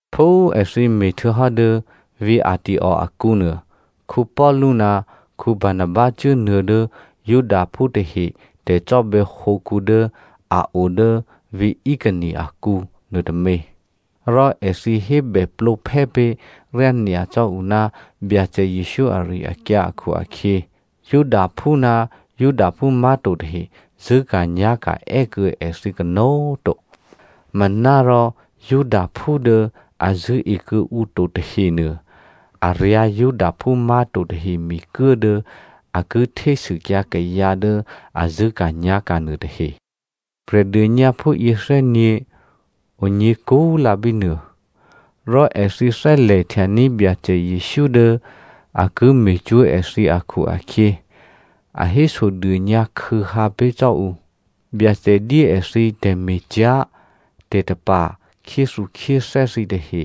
Phú èthǐ me̤htuô̌hò́ dố vǐ̤ Antioko akǔnuô, Paulu ná Barnaba cuốnuô̌ dố Judaphú tahe tè̤cò́bè̌hǒkǔ dố a o dố vǐ̤ Iconio akǔ nuôtômě. Rò èthǐ hébèplǒphè́ pé̤ ryányacò́ ǔ ná Byacè Jesǔ ari-akyǎ akhu-akhyě Judaphú ná Judaphú má̤to tahe zṳ̂́ka̤nyá̤ka̤ è́kuô̌ èthǐ kanó̤꤮ to. Manárò Judaphú dố a zṳ̂́e kuô̌ǔ to tahenuô, a ryǎ̤ Judaphú má̤to tahe mikuố dố a ki htésûkyǎ kayǎ dố a zṳ̂́ka̤nyá̤ka̤ nuôtahe. Prè̤dônyǎphú yěthè́nyě̤ onyě̤ kúlǎ bínuô. Rò èthǐ thè́lè̤htyaní̤ Byacè Jesǔ dố a ki me̤cwó̤ èthǐ akhu-akhyě, a hésodônyǎ khû̌hǎ pé̤ cò́ ǔ. Byacè dyé èthǐ tè̤me̤cyá̤ tè̤tapa̤ khyéthukhyéthè́ thǐtahe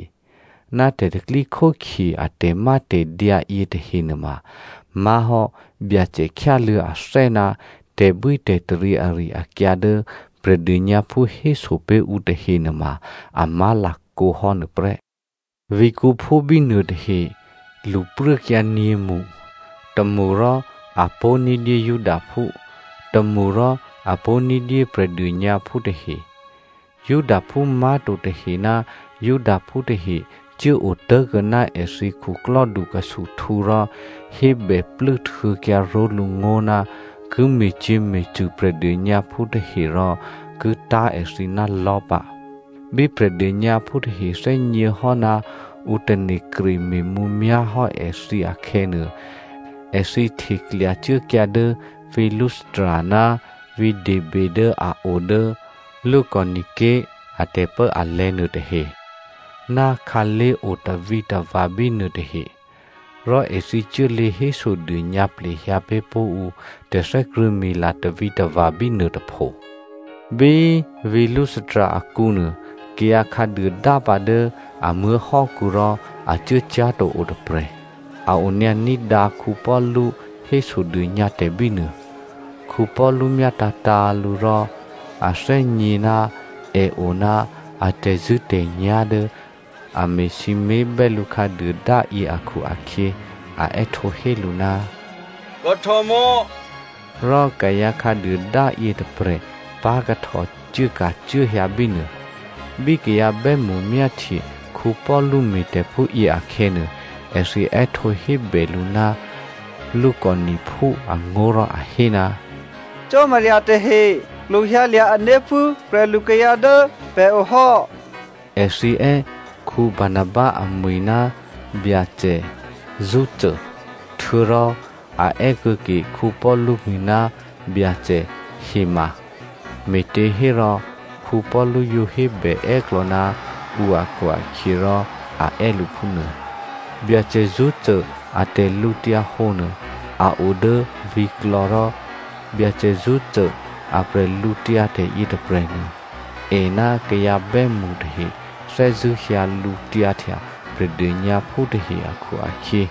ná tè̤pro̤tè̤prya̤ a tè̤mátè̤dyǎ yětahe nuôma má̤hò́ Byacè khyáluô̌ athè́ ná tè̤bwítè̤taryě ari-akyǎ dố Prè̤dônyǎphú héso pé̤ ǔ tahe nuôma a má̤lakǒhò́ nuôprè́. Vǐ̤kǔphú bínuô tahe lṳpruốkyǎ nyě̤mṳ, tômṳ rò apó̤ní̤dyé Judaphú, tômṳ rò apó̤ní̤dyé Prè̤dônyǎphú tahe. Judaphú má̤to tahe ná Judaphú tahe cuốotố̤kuô̌ ná èthǐ khuklò́dukhusuhtǔ rò hébè plû́htuô̌kyǎ ró̤lǔ ngó̤ ná ki me̤cyě̤me̤cṳ̂ Prè̤dônyǎphú tahe rò ki tá̤ èthǐ ná lò̤́ pǎ. Bí Prè̤dônyǎphú tahe thè́gněhò́ ná ǔ tane̤ kreme̤mǔmyá̤ hò́ èthǐ akhè̌nuô, èthǐ hteklya cuốkyǎ dố vǐ̤ Lystra ná vǐ̤ Derbe dố a o dố Lycaonia ké̤ a tè̤pốalè̤̌ nuôtahe, ná khǎlé̤ otavǐtava̤ bínuôtahe. Rò èthǐ cuốlě hésodônyǎ plehyǎ pé̤ pó̤ ǔ tè̤thè́krṳ̂̌mila tavǐtava̤ bínuôtôpho. Bí vǐ̤ Lystra akǔnuô kayǎ khǎduôdá pǎ dố a muố̤hò́kǔ rò a cuốcyá̤to o tôprè̤. A onyǎ ní̤dǎ Paulu hésodônyǎtè̤ bínuô. Paulu myátǎ̤tǎ̤ lǔ rò a thè́gně ná è o ná a tè̤zṳ̂́tè̤nyá̤ dố a me̤sǐmé̤bè́ lǔ khǎduôdáyě akhu-akhyě, a è́htǒhé lǔ, “kahtòmò̌” rò kayǎ khǎduôdá yětôprè̤ pá̤kahtò cuốka̤cuốhyǎ bínuô. Bí kayǎ bè́mṳ myáhtye Paulu me̤tè̤phúyě akhè̌nuô, èthǐ è́htǒ hébè lǔ ná Lycaoniaphú angó̤ rò a hé, “cò́marya tahe klwohyǎlya̤ ané̤ phú prè̤lukayǎ dố pè̤o hò́.” Èthǐ è́ Barnaba amwi̤ ná Byacè “Zeo” htuô̌rò a è́ kuô̌ke Paulu mwi̤ ná Byacè “hema”. Me̤těhérò Paulu yǒ hébè è́klò̌ ná ǔ akhu-akhyěrò a è́ lǔ phúnuô. Byacè Zeo a tè̤lǔhǒdu nuô, a o dố vǐ̤klò̌ rò Byacè Zeo a bwídu yětôprè̤nuô, è ná kayǎ bè́mṳ tahe thè́zṳ̂́ hyǎ lǔtyǎhtya Prè̤dônyǎphú tahe akhu-akhyě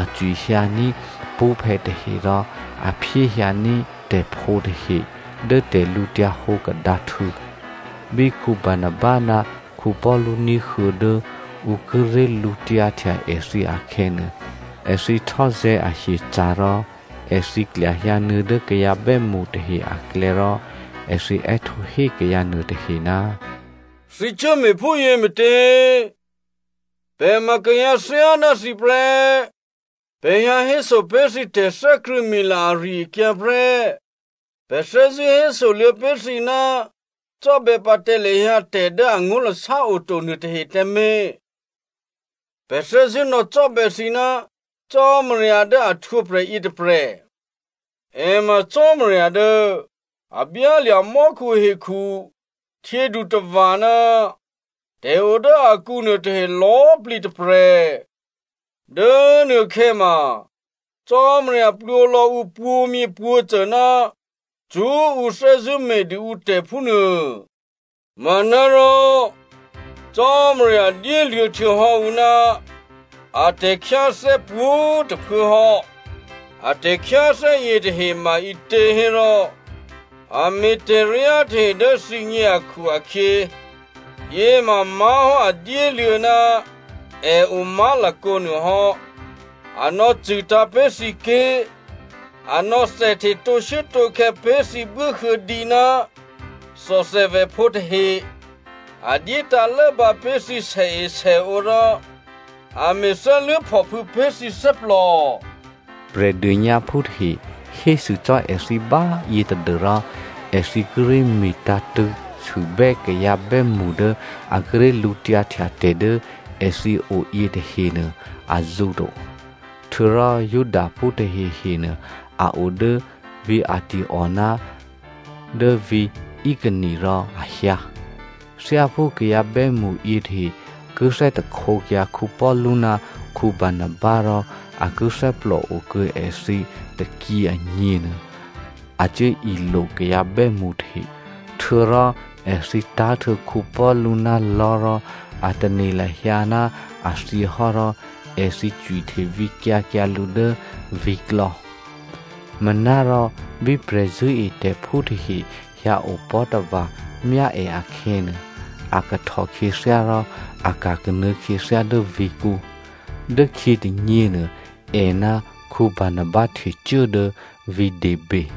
a cwihyǎní̤ pṳ́phè̌ tahe rò a phyéhyǎní̤ tè̤phǒ tahe dố tè̤lǔhǒdu kadǎhtû̌. Bí Barnaba ná Paulu ní̤huô̌ dố ǔ kíré̤ lǔtyǎhtya èthǐ akhè̌nuô, èthǐ htò́zè̤̌ ahyeca̤ rò, èthǐ klyahyǎnuô̌ dố kayǎ bè́mṳ tahe aklè̌ rò èthǐ è́htǒ hé kayǎ nuôtahe, “Thǐ cuốme̤phúyě me̤tě? Pè̤ ma kayǎ thyáná thǐ prè́. Pè̤ hyǎhéso pé̤ thǐ tè̤thè́krṳ̂̌mila ari-akyǎ prè́. Pè̤ thè́zṳ̂́ hésoluô̌ pé̤ thǐ ná cò́bè̌pǎ tǎ lahyǎ tè̤ dố angó̤lasá oto nuôtahe tǎmé̤. Pè̤ thè́zṳ̂́ nò̌cò́bè̌ thǐ ná Cò́marya dố a htwǒprè̤ yětôprè̤. È ma Cò́marya dố a byálya̤ mò́khu, hekhu, htyědutava̤ ná tè̤o dố akǔ nuôtahe lò̌꤮ plǐ tôprè̤. Dố nuôkhè̌ ma Cò́marya plwǒ lò̌ǔ pwǒ̤myěpwǒ̤cô ná cṳ́ ǔ thè́zṳ̂́ me̤dû ǔtè̤ phúnuô. Manárò Cò́marya dyéluô̌htuô̌hò́ ǔ ná a tè̤khyáthè́ pwǒ̤꤮ tôphuố hò́. A tè̤khyáthè́ yětahe ma ǐtě hérò a me̤tè̤ryá tahe dố thǐgně akhu-akhyě, yěma má̤hò́ a dyéluô̌ ná è o má̤lakǒ nuôhò́. A nò̌cṳ̂tǎ̤ pé̤ thǐ ké̤, a nò̌thèhte tǒshuốtǒkhè̌ pé̤ thǐ buốhuô̌dǐ ná thòthèvèphǒ tahe, a dyétǎ̤ lốbǎ pé̤ thǐ sèesèǒ rò a me̤ thè́luố̤phòphû̌ pé̤ thǐ thè́plò.” Prè̤dônyǎphú tahe hésû cò́ èthǐ báyě tadû́rò èthǐ kíré̤ me̤tǎ̤tṳ̂̌sûbè́ kayǎ bè́mṳ dố a kíré̤ lǔtyǎhtya tè̤ dố èthǐ o yětahe nuô azǔ to. Htuô̌rò Judaphú tahehenuô, a o dố vǐ̤ Antioko ná dố vǐ̤ Iconio rò a hyǎ. Thyáphú kayǎ bè́mṳ yětahe ki thè́htekyǎ Paulu ná Barnaba, rò a ki thè́plò okuô̌ èthǐ tôkyě agněnuô, a cuốilo kayǎ bè́mṳ tahe. Htuô̌rò èthǐ tá̤htuô̌ Paulu ná lò̤́ rò a tane̤ lahyǎ ná a thyěhò́ rò èthǐ cwihte vǐkyǎ kyǎ lǔ dố vǐ̤klò̌. Manárò bí prè̤zṳ̂́etè̤phú tahe hyǎopò̤́tava̤ myá è akhè̌nuô, a kahtò khyěthyá rò a ka̤kanuô̌ khyěthyá dố vǐ̤kǔ. Dốkhyě tônyěnuô, è ná Barnaba htecuố dố vǐ̤ Derbe.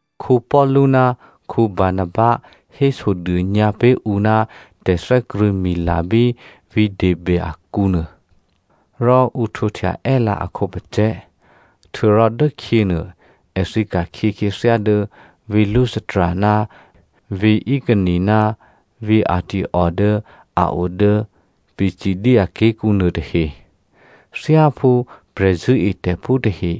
Paulu ná Barnaba hésodônyǎ pé̤ ǔ ná tè̤thè́krṳ̂̌mila bí vǐ̤ Derbe akǔ nuô, rò ǔ htwǒhtya è́lǎ a khǒpacè̤̌. Htuô̌rò dốkhyěnuô, èthǐ ka̤khyě khyěthyá dố vǐ̤ Lystra ná vǐ̤ Iconio ná vǐ̤ Antioko dố a o dố Pisidia ké̤kǔnuô tahe. Thyáphú prè̤zṳ̂́etè̤phú tahe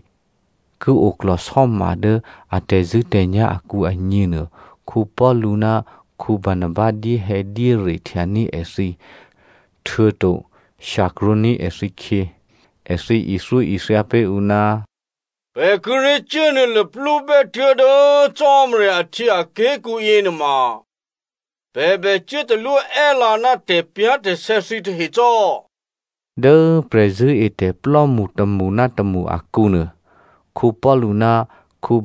ki oklò̤sò́ma dố a tè̤zṳ̂́tè̤nyá̤ akǔ agněnuô, Paulu ná Barnaba dyéhè̌dyére htyaní̤ èthǐ, htuô̌to shyakrwǒní̤ èthǐkhyě. Èthǐ ithyóithya pé̤ ǔ, “Pè̤ kíré̤ cuốnuô̌ luplúbè́ tuố̤dố Cò́marya ahtyěaké̤kǔ yěnuôma pè̤ bè cuốtalwó è́lǎ ná tè̤pyá̤tè̤sè̌ thǐtahe cò́.” Dố prè̤zṳ̂́etè̤plò́mṳ tômṳ ná tômṳ akǔnuô, Paulu ná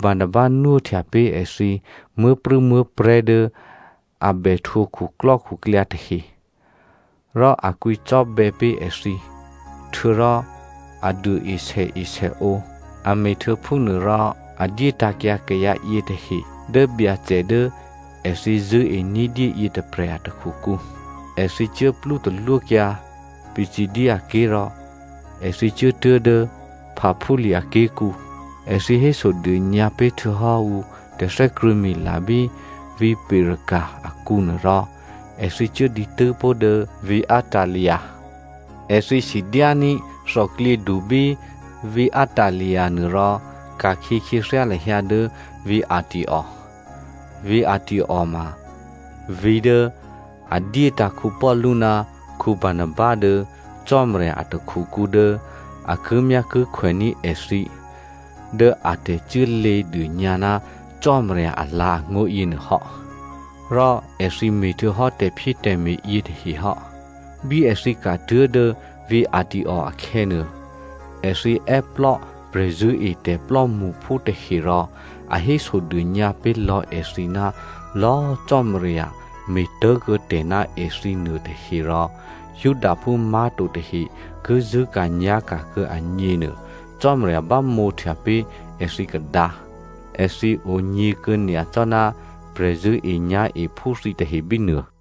Barnaba nwóhtya pé̤ èthǐ muố̤prû̌muố̤prè̤́ dố a bè htwǒ khuklò́khuklyǎ tahe. Rò a kwǐcò́bè̌ pé̤ èthǐ, htuô̌rò a duôe sèesèǒ, a me̤htuô̌ phúnuôrò a dyétǎ̤kyǎ kayǎ yětahe dố Byacè dố èthǐ zṳ̂́e ní̤dyé yětôprè̤ a takhukǔ. Èthǐ cuốplú talwókyǎ Pisidia ké̤ rò èthǐ cuốtuố̤ dố Pamphylia ké̤kǔ. Èthǐ hésodônyǎ pé̤htuô̌hò́ ǔ tè̤thè́krṳ̂̌mila bí vǐ̤ Perga akǔnuô rò èthǐ cuố dǐtû́ pó̤ dố vǐ̤ Attalia. Èthǐ sidyání̤ thòklyědu bí vǐ̤ Attalia nuô rò ka̤khyě khyěthyá lahyǎ dố vǐ̤ Antioko. Vǐ̤ Antioko ma vǐ̤ dố a dyétǎ̤ Paulu ná Barnaba dố Cò́marya a takhukǔ dố a kimyákikhwèní̤ èthǐ dố a tè̤cuốlě dônyǎ ná Cò́marya alǎ̤angó̤ yěnuô hò́. Rò èthǐ me̤htuô̌hò́ tè̤phyétè̤me̤ yětahe hò́. Bí èthǐ ka̤tuố̤ dố vǐ̤ Antioko akhè̌nuô, èthǐ è́plò́ prè̤zṳ̂́etè̤ plò́mṳphú tahe rò a hésodônyǎ pé̤lò̌ èthǐ ná lò̌꤮ Cò́marya me̤tố̤kuô̌tè̤ ná èthǐ nuôtahe rò Judaphú má̤to tahe ki zṳ̂́ka̤nyá̤ka̤ kuô̌ agně nuô, Cò́marya bámǒhtya pé̤ èthǐ kadǎ. Èthǐ onyě̤kuô̌ nyacò́ ná prè̤zṳ̂́enyá̤ephú thǐtahe bínuô.